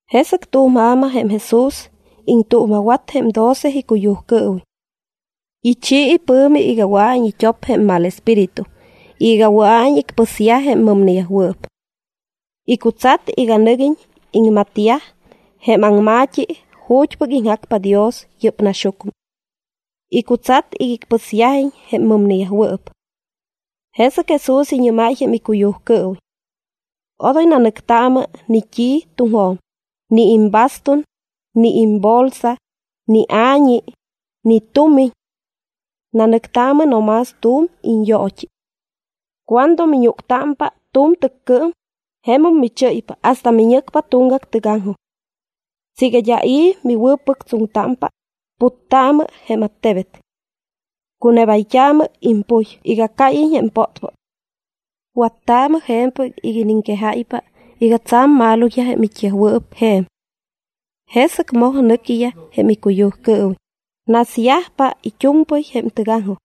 Jesɨc tu̱m ja̱ma jém Jesús iŋtuuma̱wat jém doce icuyujcɨɨwiñ. Ichi ipɨ̱mi iga wɨa̱iñ it́op jém mal espíritu y iga wɨa̱iñ icpɨsyaj jém mɨmneyajwɨɨp. Icutsat iga nɨguiñ iŋmatyaj jém aŋma̱t́i ju̱t́pɨc iŋjacpa Dios yɨ́p naxyucmɨ. Icutsat iga icpɨsyajiñ jém mɨmneyajwɨɨp. Jesɨc Jesús iñɨ́máy jém icuyujcɨɨwiñ: —Odoy nanɨctaamɨ ni t́i tuŋjo̱m, ni imbastun, ni imbolsa, ni a̱ñi, ni tumiñ. Nanɨctaamɨ no más tu̱m iñyoot́i. Cuando miñúctámpa tu̱m tɨccɨɨm, jemum michɨ́ypa hasta miñɨcpa tuŋgac tɨgaŋjoj. Siiga d́a i̱ miwɨ̱pɨctsoŋtámpa, puttaamɨ jém attebet. Cunebayt́aamɨ impuy iga cáyiñ jém pótpót. Wattaamɨ je̱mpɨc iga iniŋquejáypa iga tsa̱m maloyaj jém it́yajwɨɨp je̱m. Jesɨc moj nɨquiyaj jém icuyujcɨɨwiñ, nasyajpa it́u̱mpɨy jém tɨgaŋjoj.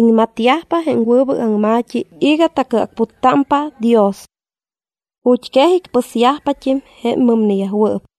Iŋmatyajpa jém wɨbɨc aŋma̱t́i iga tacɨacputtámpa Dios. Ju̱t́quej icpɨsyajpat́im jém mɨmneyajwɨɨp.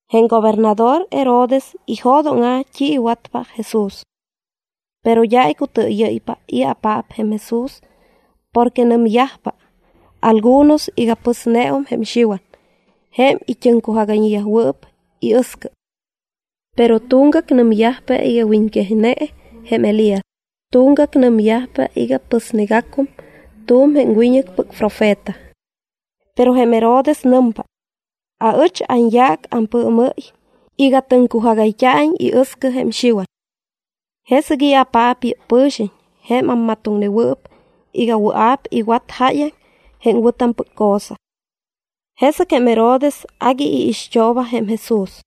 Jém gobernador Herodes ijo̱dóŋa̱ t́i iwatpa Jesús. Pero d́a icutɨɨyɨ́ypa i̱apaap jém Jesús porque nɨmyajpa algunos iga pɨsneum jém Xiwan jém it́ɨŋcujagayñewɨɨp iɨscɨ. Pero tuŋgac nɨmyajpa iga wiñquejne jém Elías, tuŋgac nɨmyajpa iga pɨsnegacum tu̱m jém wiñɨcpɨc profeta. Pero jém Herodes nɨmpa: —Aɨch anyaac ampɨɨmɨ́y iga tɨŋcujagayt́a̱iñ iɨscɨ jém Xiwan. ¿Jesɨc i̱apaap yɨ́p pɨ̱xiñ jém ammatoŋnewɨɨp iga wɨa̱p iwat jáyaŋ jém wɨ̱tampɨc cosa? Jesɨc jém Herodes agui iixt́ooba jém Jesús.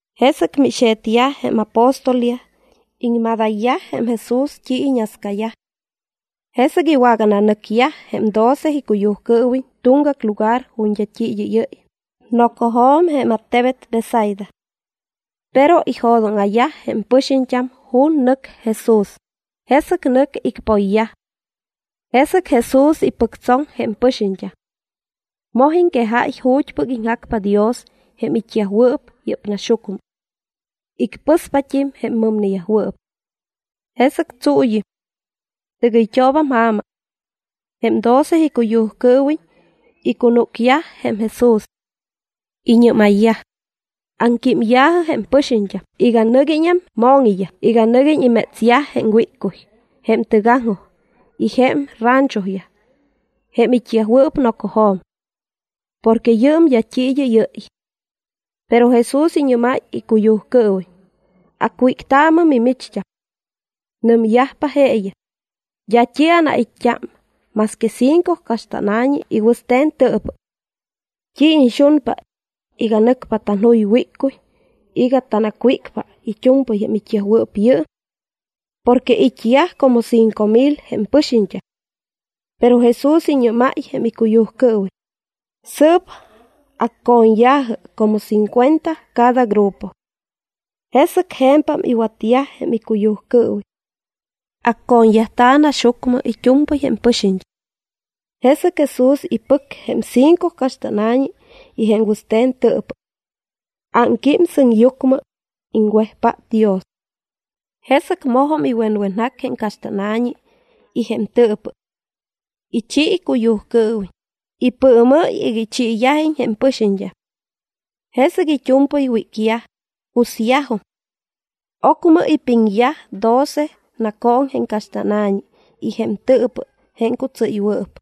Jesɨc mixe̱tyaj jém apóstolyaj, iŋmadayyaj jém Jesús t́i iñascayaj. Jesɨc iwagananɨcyaj jém doce icuyujcɨɨwiñ tuŋgac lugar ju̱t́ d́a t́i id́ɨ́yɨ́y, nocojo̱m jém attebet Betsaida. Pero ijo̱dóŋa̱yaj jém pɨxiñt́am ju̱t́ nɨc Jesús, jesɨc nɨc icpoyyaj. Jesɨc Jesús ipɨctsoŋ jém pɨxiñt́am. Moj iŋquejáy ju̱t́pɨc iŋjacpa Dios jém it́yajwɨɨp yɨ́p naxyucmɨ. Icpɨspat́im jém mɨmneyajwɨɨp. Jesɨc tsuuyɨm. Tɨgɨyt́oobam ja̱ma. Jém doce icuyujcɨɨwiñ icunúcyaj jém Jesús. Iñɨ́mayyaj: —Aŋquímya̱jɨ jém pɨxiñt́am iga nɨguiñam mo̱ŋiyaj iga nɨguiñ imétsyaj jém wíccuy jém tɨgaŋjoj y jém ranchoyaj jém it́yajwɨɨp nocojo̱m. Porque yɨɨm d́a t́i id́ɨ́yɨ́y. Pero Jesús iñɨ́máy icuyujcɨɨwiñ: —Acwíctaamɨ mimicht́am. Nɨmyajpa jeeyaj: —D́a t́i anait́t́a más que cinco caxt́ána̱ñi y wɨste̱n tɨɨpɨ. ¿T́i iñxunpa, iga nɨcpa tanjuy wíccuy iga tanacwícpa it́u̱mpɨy jém it́yajwɨɨp yɨɨm? Porque it́yaj como cinco mil jém pɨxiñt́am. Pero Jesús iñɨ́máy jém icuyujcɨɨwiñ: —Sɨɨp acco̱ñya̱jɨ como cincuenta cada grupo. Jesɨc je̱mpam iwatyaj jém icuyujcɨɨwiñ. Acco̱ñyajta̱ naxyucmɨ it́u̱mpɨy jém pɨxiñt́am. Jesɨc Jesús ipɨc jém cinco caxt́ána̱ñi y jém wɨste̱n tɨɨpɨ. Ámquím sɨŋyucmɨ, iŋwejpát Dios. Jesɨc mojum iwenwenjac jém caxt́ána̱ñi y jém tɨɨpɨ. Ichi icuyujcɨɨwiñ, ipɨɨmɨ́y iga ichiiyajiñ jém pɨxiñt́am. Jesɨc it́u̱mpɨy wícyaj, cusyajum. Ocmɨ ipiŋyaj doce nacooŋ jém caxt́ána̱ñi y jém tɨɨpɨ jém cutsɨ́ywɨɨp.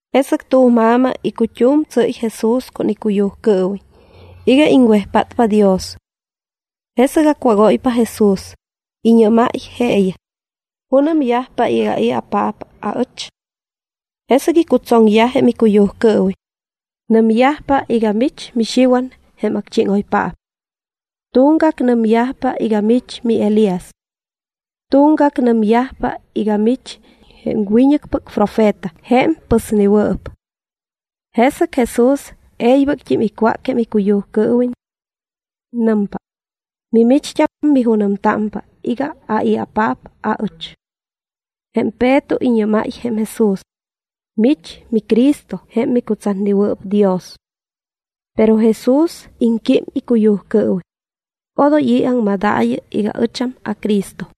Jesɨc tu̱m ja̱ma icut́um tsɨ́y Jesús con icuyujcɨɨwiñ iga iŋwejpátpa Dios. Jesɨc acwágóypa Jesús, iñɨ́máy jeeyaj: —¿Junɨmyajpa iga ai̱apaap aɨch? Jesɨc icutsoŋyaj jém icuyujcɨɨwiñ: —Nɨmyajpa iga mich miXiwan jém acchíŋoypaap. Tuŋgac nɨmyajpa iga mich miElías. Tuŋgac nɨmyajpa iga mich jém wiñɨcpɨc profeta jém pɨsnewɨɨp. Jesɨc Jesús e̱ybɨct́im icwác jém icuyujcɨɨwiñ. Nɨmpa: —¿Mimicht́am, mijunɨmtámpa iga ai̱apaap aɨch? Jém Peto iñɨ́máy jém Jesús: —Mich miCristo jém micutsatnewɨɨp Dios. Pero Jesús iŋquím icuyujcɨɨwiñ: —Odoy i̱ aŋmadaayɨ iga ɨcham aCristo.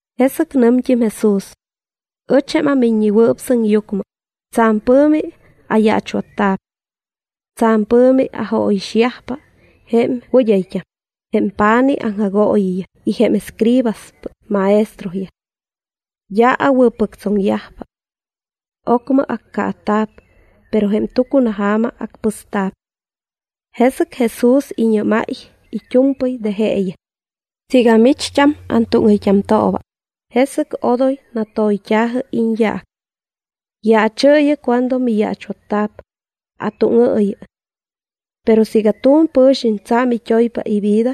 Jesɨc nɨmt́im Jesús: —Ɨch, jém aMiññewɨɨp Sɨŋyucmɨ, tsa̱m pɨ̱mi ayaachwatta̱p. Tsa̱m pɨ̱mi ajóyixyajpa jém wɨd́ayt́am, jém pa̱nij aŋjagooyiyaj y jém escribaspɨc maestroyaj. D́a awɨ̱pɨctsoŋyajpa. Ocmɨ accaata̱p, pero jém tucunaja̱ma acpɨsta̱p. Jesɨc Jesús iñɨ́máy it́u̱mpɨy de jeeyaj: —Siiga micht́am antúŋɨyt́amtooba, jesɨc odoy natoyt́a̱jɨ iñyaac. Yaachɨɨyɨ cuando miyaachwatta̱p, atúŋɨɨyɨ. Pero siiga tu̱m pɨ̱xiñ tsa̱m it́oypa ivida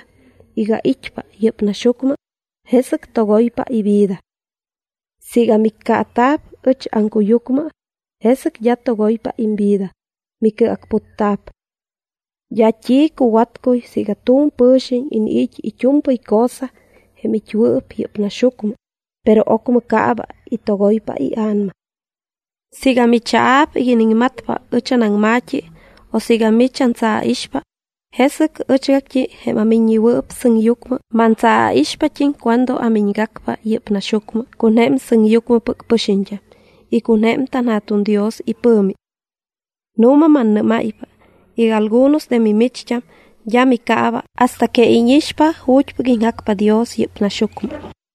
iga it́pa yɨ́p naxyucmɨ, jesɨc togoypa ivida. Siiga miccaata̱p ɨch aŋcuyucmɨ, jesɨc d́a togoypa imvida, micɨacputta̱p. D́a t́i cuwatcuy siiga tu̱m pɨ̱xiñ iniit́ it́u̱mpɨy cosa jém it́wɨɨp yɨ́p naxyucmɨ, pero ocmɨ caaba y togoypa ia̱nama. Siiga michaa̱p iga iniŋmatpa ɨch anaŋma̱t́i o siiga mich antsaaixpa, jesɨc ɨchgact́i jém aMiññewɨɨp Sɨŋyucmɨ mantsaaixpat́im cuando amiñgacpa yɨ́p naxyucmɨ con jém sɨŋyucmɨpɨc pɨxiñt́am y con jém tanJa̱tuŋ Dios ipɨ̱mi. Nu̱ma mannɨ́máypa iga algunos de mimicht́am d́a micaaba hasta que íñixpa ju̱t́pɨc iŋjacpa Dios yɨ́p naxyucmɨ.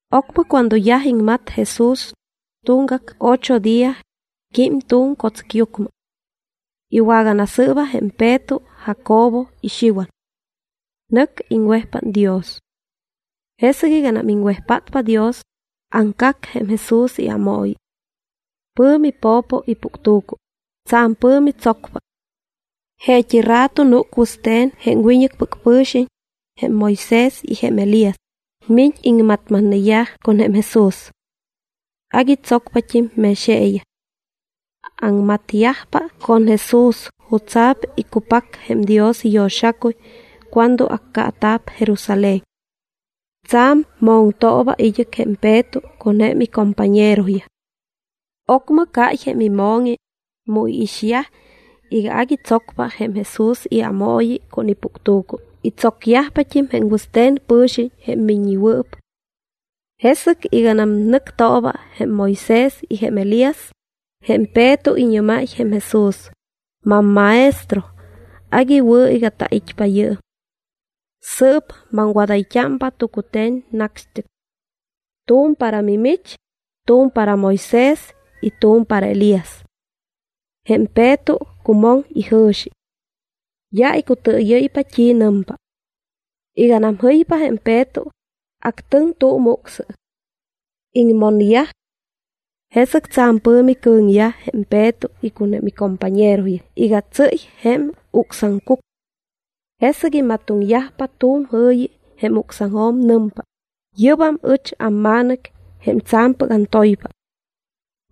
Ocmɨ cuando yaj iŋmat Jesús, tuŋgac ocho día, quím tu̱m co̱tsɨcyucmɨ. Iwaganasɨɨba jém Peto, Jacobo y Xiwan. Nɨc iŋwejpát Dios. Jesɨc iganam iŋwejpátpa Dios, aŋcac jém Jesús iámooyi. Pɨ̱mi po̱po ipuctu̱cu, tsa̱m pɨ̱mi tsocpa. Jeet́i rato núc wɨste̱n jém wiñɨcpɨc pɨ̱xiñ, jém Moisés y jém Elías, miñ iŋmatmatneyaj con jém Jesús. Agui tsocpat́im mex jeeyaj. Aŋmatyajpa con Jesús jutsa̱p iccupac jém Dios iyo̱xacuy cuando accaata̱p Jerusalén. Tsa̱m moŋtooba id́ɨc jém Peto con jém icompañeroyaj. Ocmɨ cáy jém imo̱ŋi, mu iixyaj iga agui tsocpa jém Jesús iámooyi con ipuctu̱cu y tsocyajpat́im jém wɨste̱n pɨ̱xiñ jém miññewɨɨp. Jesɨc iganam nɨctooba jém Moisés y Elías, jém Peto iñɨ́máy jém Jesús: —MamMaestro, agui wɨ̱ iga tait́pa yɨɨm. Sɨɨp maŋwadayt́ámpa tucute̱n nacxt́ɨc. Tu̱m para mimich, tu̱m para Moisés y tu̱m para Elías. Jém Peto cumoŋ ijɨ̱xi. D́a icutɨɨyɨ́ypa t́i nɨmpa. Iganam jɨypa jém Peto, actɨŋ tu̱m ucsɨ. Iŋmonyaj. Jesɨc tsa̱m pɨ̱mi cɨ̱ŋyaj jém Peto con jém icompañeroyaj iga tsɨ́y jém ucscucɨɨm. Jesɨgam imatoŋyajpa tu̱m jɨ̱yi jém ucsaŋjo̱m. Nɨmpa: —Yɨ́bam ɨch amMa̱nɨc, jém tsa̱mpɨc antoypa.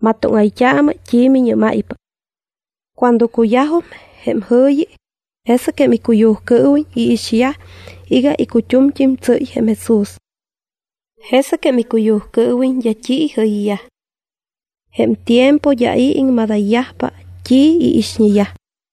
Matoŋtaamɨ t́i miñɨ́máypa. Cuando cuyajum jém jɨ̱yi, jesɨc jém icuyujcɨɨwiñ iixyaj iga icut́umt́im tsɨ́y jém Jesús. Jesɨc jém icuyujcɨɨwiñ d́a t́i ijɨyyaj. Jém tiempo d́a i̱ iŋmadayyajpa t́i iixñeyaj.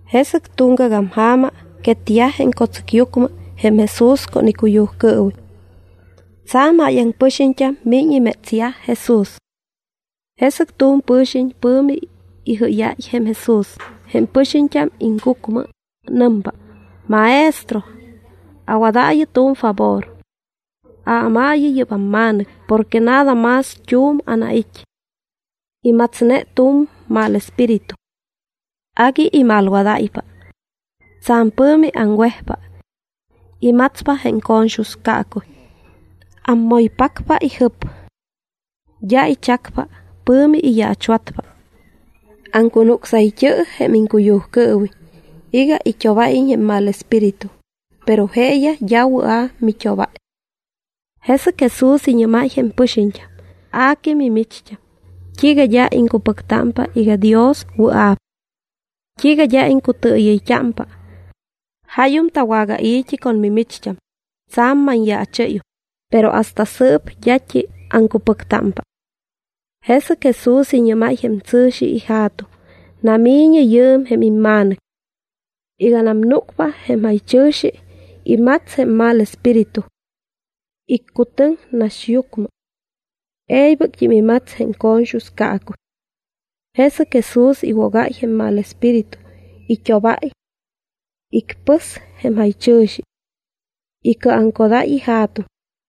Jesɨc tuŋgagam ja̱ma quetyaj jém co̱tsɨcyucmɨ jém Jesús con icuyujcɨɨwiñ. Tsa̱m jáyaŋ pɨxiñt́am miñ imétsyaj Jesús. Jesɨc tu̱m pɨ̱xiñ pɨ̱mi ijɨ́yáy jém Jesús jém pɨxiñt́am aŋcucmɨ. Nɨmpa: —Maestro, awadaayɨ tu̱m favor. Aámaayɨ yɨ́p amma̱nɨc porque nada más tu̱m anait́. Imatsne tu̱m mal espíritu. Agui imalwadáypa. Tsa̱m pɨ̱mi aŋwejpa. Imatspa jém co̱ñxus caacuy. Aŋmoypacpa ijɨp. D́a ichacpa, pɨ̱mi iyaachwatpa. Aŋcunucsayt́ɨp jém iŋcuyujcɨɨwiñ iga it́obáyiñ jém mal espíritu, pero jeeyaj d́a wɨa̱ mit́obáy. Jesɨc Jesús iñɨ́máy jém pɨxiñt́am: —A que mimicht́am, ¿t́iiga d́a iŋcupɨctámpa iga Dios wɨa̱p? ¿T́iiga d́a iŋcutɨɨyɨyt́ámpa? Jáyum tawagai̱t́i con mimicht́am, tsa̱m manyaachɨ́yum, pero hasta sɨɨp d́at́im aŋcupɨctámpa. Jesɨc Jesús iñɨ́máy jém tsɨ̱xi ija̱tuŋ: —Nami̱ñɨ yɨɨm jém imma̱nɨc. Iganam núcpa jém jaychɨ̱xi, imats jém mal espíritu. Iccutɨŋ naxyucmɨ. E̱ybɨct́im imats jém co̱ñxus caacuy. Jesɨc Jesús iwogáy jém mal espíritu, it́obáy. Icpɨs jém jaychɨ̱xi. Icɨɨjuŋcodáy ija̱tuŋ.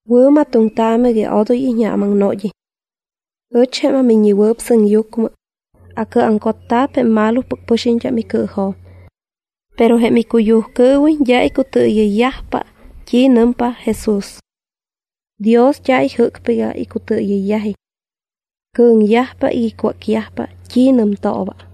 —Wɨ̱matoŋtaamɨ iga odoy iñjaamaŋnod́iñ. Ɨch, jém aMiññewɨɨp Sɨŋyucmɨ, acɨɨjuŋcotta̱p jém malopɨc pɨxiñt́am icɨɨjo̱m. Pero jém icuyujcɨɨwiñ d́a icutɨɨyɨyyajpa t́i nɨmpa Jesús. Dios d́a ijɨ́cpa iga icutɨɨyɨyyajiñ. Cɨ̱ŋyajpa iga icwácyajpa t́i nɨmtooba.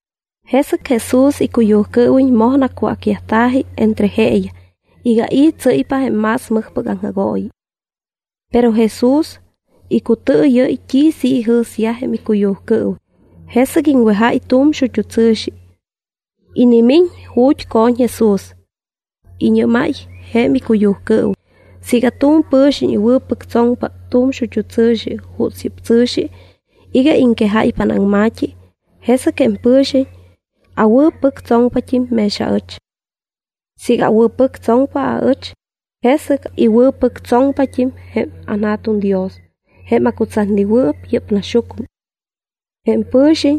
Jesɨc Jesús icuyujcɨɨwiñ moj nacwácyajta̱ji entre jeeyaj iga i̱ tsɨ́ypa jém más mɨjpɨc aŋjagooyi. Pero Jesús icutɨɨyɨ́y t́i sɨ́p ijɨ̱syaj jém icuyujcɨɨwiñ, jesɨc iŋwejáy tu̱m xut́u tsɨ̱xi. Inimiñ ju̱t́ co̱ñ Jesús. Iñɨ́máy jém icuyujcɨɨwiñ: —Siiga tu̱m pɨ̱xiñ iwɨ̱pɨctsoŋpa tu̱m xut́u tsɨ̱xi juuts yɨ́p tsɨ̱xi iga iŋquejáypa anaŋma̱t́i, jesɨc jém pɨ̱xiñ awɨ̱pɨctsoŋpat́im mex aɨch. Siiga awɨ̱pɨctsoŋpa aɨch, jesɨc iwɨ̱pɨctsoŋpat́im jém anJa̱tuŋ Dios jém acutsatnewɨɨp yɨ́p naxyucmɨ. Jém pɨ̱xiñ,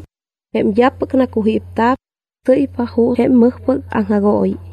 jém d́apɨc nacujípta̱p, tsɨ́ypa juuts jém mɨjpɨc aŋjagooyi.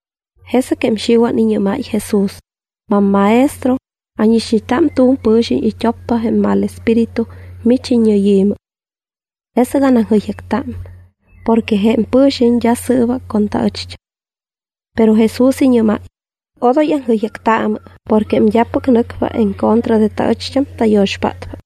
Jesɨc jém Xiwan iñɨ́máy Jesús: —MamMaestro, ánixñeta tu̱m pɨ̱xiñ it́oppa jém mal espíritu mich iññɨyi̱mɨ. Jesɨc anaŋjɨyjacta porque jém pɨ̱xiñ d́a sɨɨba con taɨcht́am. Pero Jesús iñɨ́máy: —Odoy aŋjɨyjactaamɨ porque jém d́apɨc nɨcpa en contra de taɨcht́am, tayo̱xpátpa.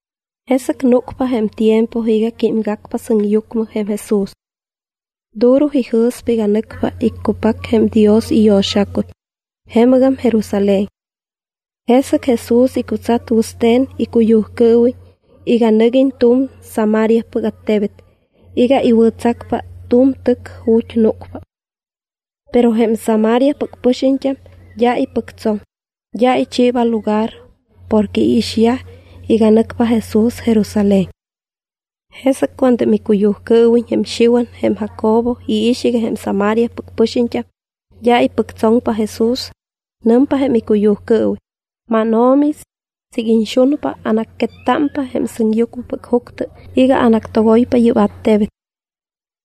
Jesɨc núcpa jém tiempo iga químgacpa sɨŋyucmɨ jém Jesús. Duro ijɨ̱spa iga nɨcpa iccupac jém Dios iyo̱xacuy jemɨgam Jerusalén. Jesɨc Jesús icutsat wɨste̱n icuyujcɨɨwiñ iga nɨguiñ tu̱m Samariapɨc attebet iga iwɨ̱tsacpa tu̱m tɨc ju̱t́ núcpa. Pero jém Samariapɨc pɨxiñt́am d́a ipɨctsoŋ, d́a ichiiba lugar porque iixyaj iga nɨcpa Jesús Jerusalén. Jesɨc cuando jém icuyujcɨɨwiñ jém Xiwan y jém Jacobo iix iga jém Samariapɨc pɨxiñt́am d́a ipɨctsoŋpa Jesús, nɨmpa jém icuyujcɨɨwiñ: —MánO̱mi, siiga iñxunpa, anacquettámpa jém sɨŋyucmɨpɨc juctɨ iga anactogoypa yɨ́p attebet.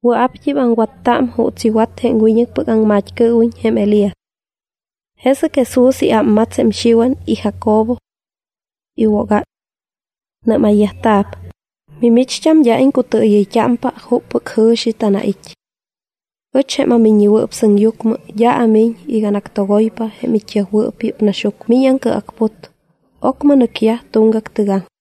Wɨa̱pt́im aŋwatta juuts iwat jém wiñɨcpɨc aŋmat́cɨɨwiñ jém Elías. Jesɨc Jesús iámmats jém Xiwan y Jacobo. Iwogáy. Nɨ́mayyajta̱p: —Mimicht́am, d́a iŋcutɨɨyɨyt́ámpa juppɨc jɨ̱xi tanait́. Ɨch jém aMiññewɨɨp Sɨŋyucmɨ d́a amiñ iga anactogoypa jém it́yajwɨɨp yɨ́p naxyucmɨ, miñ aŋcɨacput. Ocmɨ nɨcyaj tuŋgac tɨgaŋjoj.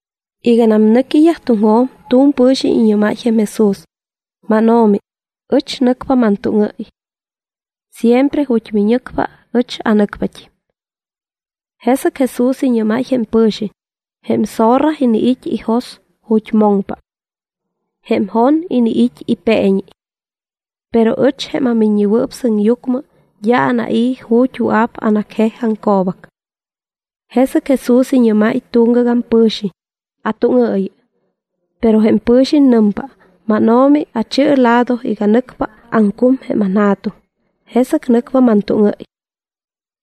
Iganam nɨquiyaj tuŋjo̱m, tu̱m pɨ̱xiñ iñɨ́máy jém Jesús: —MánO̱mi, ɨch nɨcpa mantúŋɨ́y. Siempre ju̱t́ miñɨcpa ɨch anɨcpat́im. Jesɨc Jesús iñɨ́máy jém pɨ̱xiñ: —Jém zorra iniit́ ijos ju̱t́ moŋpa. Jém jon iniit́ ipeeñi. Pero ɨch, jém aMiññewɨɨp Sɨŋyucmɨ, d́a anai̱ ju̱t́ wɨa̱p anacjej aŋco̱bac. Jesɨc Jesús iñɨ́máy tuŋgagam pɨ̱xiñ: —Atúŋɨɨyɨ. Pero jém pɨ̱xiñ nɨmpa: —MánO̱mi, achi̱ɨ lado iga nɨcpa aŋcum jém anja̱tuŋ, jesɨc nɨcpa mantúŋɨ́y.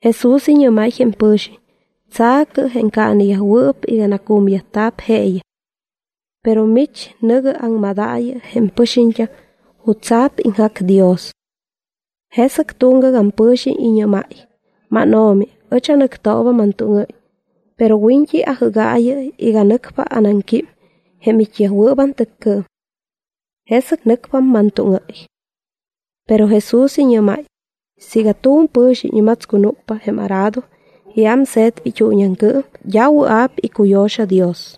Jesús iñɨ́máy jém pɨ̱xiñ: —Tsa̱cɨ jém caaneyajwɨɨp iga nacumyajta̱p jeeyaj. Pero mich nɨ̱gɨ aŋmadaayɨ jém pɨxiñt́am jutsa̱p iŋjac Dios. Jesɨc tuŋgagam pɨ̱xiñ iñɨ́máy: —MánO̱mi, ɨch nɨctooba mantúŋɨ́y, pero wiñt́i ajɨ́gaayɨ iga nɨcpa anaŋquím jém it́yajwɨɨp antɨccɨɨm. Jesɨc nɨcpa mantúŋɨ́y. Pero Jesús iñɨ́máy: —Siiga tu̱m pɨ̱xiñ imatscunúcpa jém arado y ámse̱tpa it́uuñiaŋcɨɨm, d́a wɨa̱p icuyo̱xa̱ Dios.